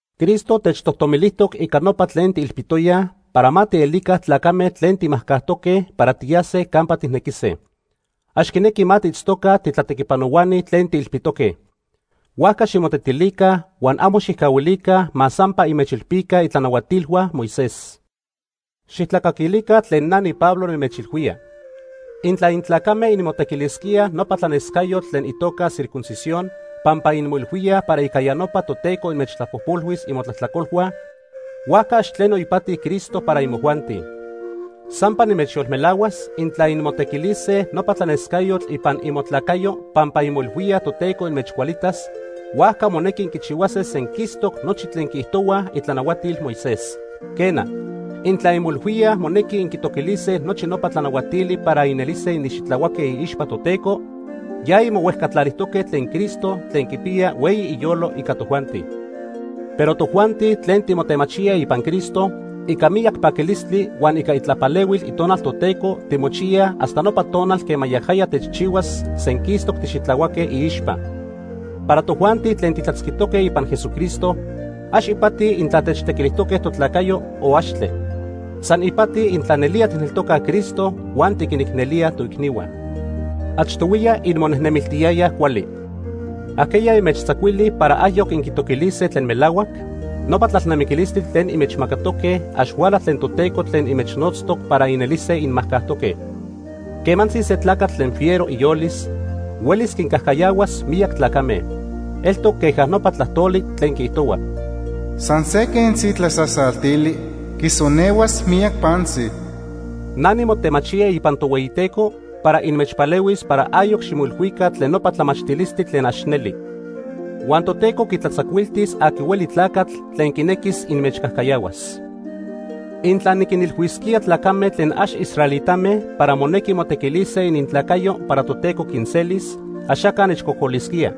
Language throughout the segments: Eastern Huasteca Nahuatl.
Cristo techtojtomilijtoc ica nopa tlen tiilpitoyaj para ma tielica tlacame tlen timajcajtoque para tiyase campa tijnequise. Ax quinequi ma tiitztoca titlatequipanohuani tlen tiilpitoque. Huajca ximotetilica huan amo xijcahuilica ma sampa inmechilpica itlanahuatilhua Moisés. Xijtlacaquilica tlen na niPablo nimechilhuía. Intla intlacame inmotequilisquíaj nopa tlanescayotl tlen itoca circuncisión pampa inmoilhuíaj para ica ya nopa Toteco inmechtlapojpolhuis imotlajtlacolhua, huajca ax tleno ipati Cristo para imojuanti. Sampa nimechyolmelahuas, intla inmotequilise nopa tlanescayotl ipan imotlacayo pampa inmoilhuíaj Toteco inmechcualitas, huajca monequi inquichihuase senquistoc nochi tlen quiijtohuaj itlanahuatil Moisés. Quena, intla inmoilhuíaj monequi inquintoquilise nochi nopa tlanahuatili para inelise inxitlahuaque iixpa Toteco, ya inmohuejcatlalijtoque tlen Cristo tlen quipiya hueyi iyolo ica tojuanti. Pero tojuanti tlen timotemachíaj ipan Cristo, ica miyac paquilistli huan ica itlapalehuil Itonal Toteco timochiyaj hasta nopa tonal quema yajaya techchihuas senquistoc tixitlahuaque iixpa. Para tojuanti tlen titlatzquitoque ipan Jesucristo, ax ipati intla techtequilijtoque totlacayo o axtle. San ipati intla nelía tijneltocaj Cristo huan tiquinicnelíaj toicnihua. Achtohuiya inmonejnemiltiyayaj cuali. ¿Ajqueya inmechtzacuili para ayoc inquitoquilíaj tlen melahuac? Nopa tlalnamiquilistli tlen inmechmacatoque ax huala tlen Toteco tlen inmechnotztoc para inelise inmajcajtoque. Quemantzi se tlacatl tlen fiero iyolis huelis quincajcayahuas miyac tlacame. Eltoc queja nopa tlajtoli tlen quiijtohua: “San se quentzi tlasasaltili quisonehuas miyac pantzi.” Na nimotemachía ipan Tohueyiteco para inmechpalehuis para ayoc ximoilhuica tlen nopa tlamachtilistli tlen ax neli. Huan Toteco quitlatzacuiltis aqui hueli tlacatl tlen quinequis inmechcajcayahuas. Intla niquinilhuisquía tlacame tlen ax israelitame para monequi motequilise inintlacayo para Toteco quinselis, axaca nechcocolisquía.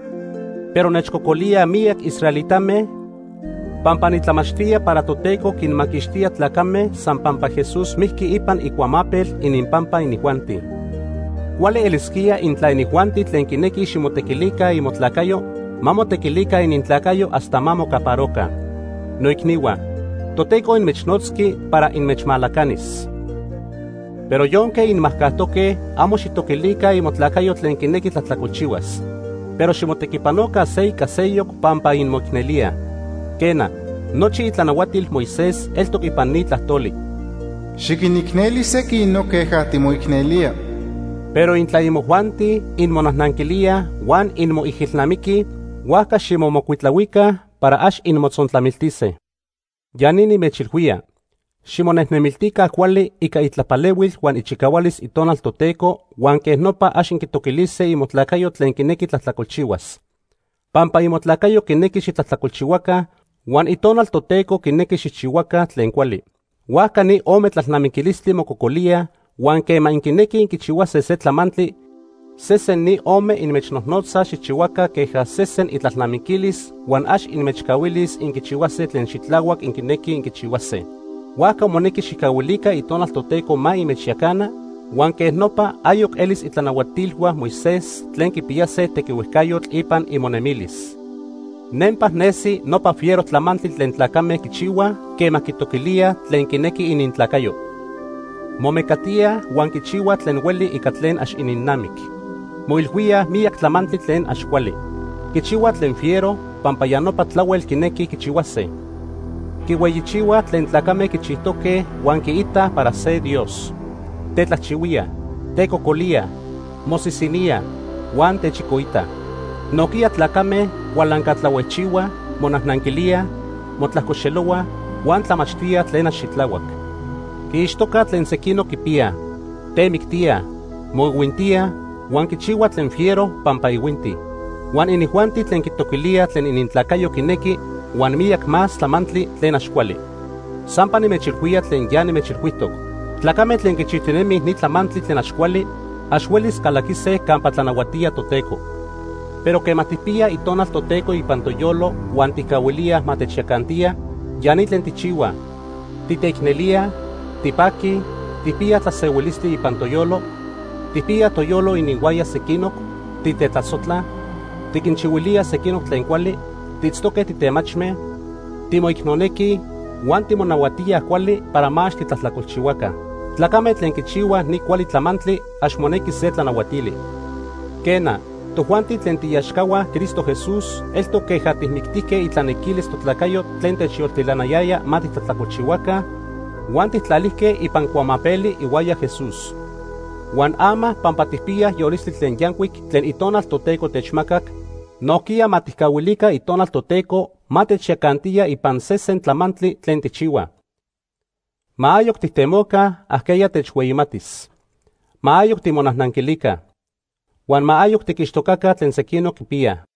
Pero nechcocolíaj miyac israelitame pampa nitlamachtía para Toteco quinmaquixtía tlacame san pampa Jesús mijqui ipan icuamapel ininpampa inijuanti. Cuali elisquía intla inijuanti tlen quinequij ximotequilica imotlacayo, ma motequilica inintlacayo hasta ma mocaparoca. Noicnihua, Toteco inmechnotzqui para inmechmalacanis. Pero yonque inmajcajtoque, amo xijtoquilica imotlacayo tlen quinequi tlajtlacolchihuas. Pero ximotequipanoca se ica seyoc pampa inmoicnelíaj. Quena, nochi itlanahuatil Moisés eltoc ipan ni tlajtoli: “Xiquinicneli sequinoc queja timoicnelía.” Pero intla imojuanti inmonajnanquilíaj huan inmoijilnamiquij, huajca ximomocuitlahuica para ax inmotzontlamiltise. Ya ni nimechilhuía: Ximonejnemiltica cuali ica itlapalehuil huan ichicahualis Itonal Toteco huan quej nopa ax inquitoquilise imotlacayo tlen quinequi tlajtlacolchihuas. Pampa imotlacayo quinequi xitlajtlacolchihuaca, huan Itonal Toteco quinequi xijchihuaca tlen cuali. Huajca ni ome tlalnamiquilistli mococolíaj huan quema inquinequij inquichihuase se tlamantli, sesen ni ome inmechnojnotza xijchihuaca queja sesen itlalnamiquilis huan ax inmechcahuilis inquichihuase tlen xitlahuac inquinequij inquichihuase. Huajca monequi xijcahuilica Itonal Toteco ma inmechyacana, huan quej nopa ayoc elis itlanahuatilhua Moisés tlen quipiyase tequihuejcayotl ipan imonemilis. Nempa nesi nopa fiero tlamantli tlen tlacame quichihuaj quema quitoquilíaj tlen quinequi inintlacayo. Momecatíaj huan quichihuaj tlen hueli ica tlen ax ininnamic. Moilhuíaj miyac tlamantli tlen ax cuali. Quichihuaj tlen fiero pampa ya nopa tlahuel quinequij quichihuase. Quihueyichihuaj tlen tlacame quichijtoque huan quiitaj para se dios. Tetlajchihuíaj, tecocolíaj, mosisiníaj, huan techicoitaj. Nojquiya tlacame cualancatlahuejchihuaj, monajnanquilíaj, motlajcoxelohuaj, huan tlamachtíaj tlen ax xitlahuac. Quiixtocaj tlen sequinoc quipiyaj, temictíaj, moihuintíaj huan quichihuaj tlen fiero pampa ihuintij. Huan inijuanti tlen quitoquilíaj tlen inintlacayo quinequi huan miyac más tlamantli tlen ax cuali. Sampa nimechilhuía tlen ya nimechilhuijtoc. Tlacame tlen quichijtinemij ni tlamantli tlen ax cuali, ax huelis calaquise campa tlanahuatía Toteco. Pero quema tijpiyaj Itonal Toteco ipan toyolo huan tijcahuilíaj ma techyacantiya, ya ni tlen tijchihuaj: Titeicnelíaj, tipaquij, tijpiyaj tlasehuilistli ipan toyolo, tijpiyaj toyolo ininhuaya sequinoc, titetlasojtlaj, tiquinchihuilíaj sequinoc tlen cuali, tiitztoque titemachme, timoicnonequij huan timonahuatíaj cuali para ma ax titlajtlacolchihuaca. Tlacame tlen quichihuaj ni cuali tlamantli ax monequi se tlanahuatili. Quena, tojuanti tlen tiiaxcahua Cristo Jesús eltoc queja tijmictijque itlanequilis totlacayo tlen techyoltilanayaya ma titlajtlacolchihuaca huan tijtlalijque ipan cuamapeli ihuaya Jesús. Huan ama pampa tijpiyaj yolistli tlen yancuic tlen Itonal Toteco techmacac, nojquiya ma tijcahuilica Itonal Toteco ma techyacantiya ipan sesen tlamantli tlen tijchihuaj. Ma ayoc tijtemoca ajqueya techhueyimatis. Ma ayoc timonajnanquilica. Huan ma ayoc tiquixtocaca tlen sequinoc quipiyaj.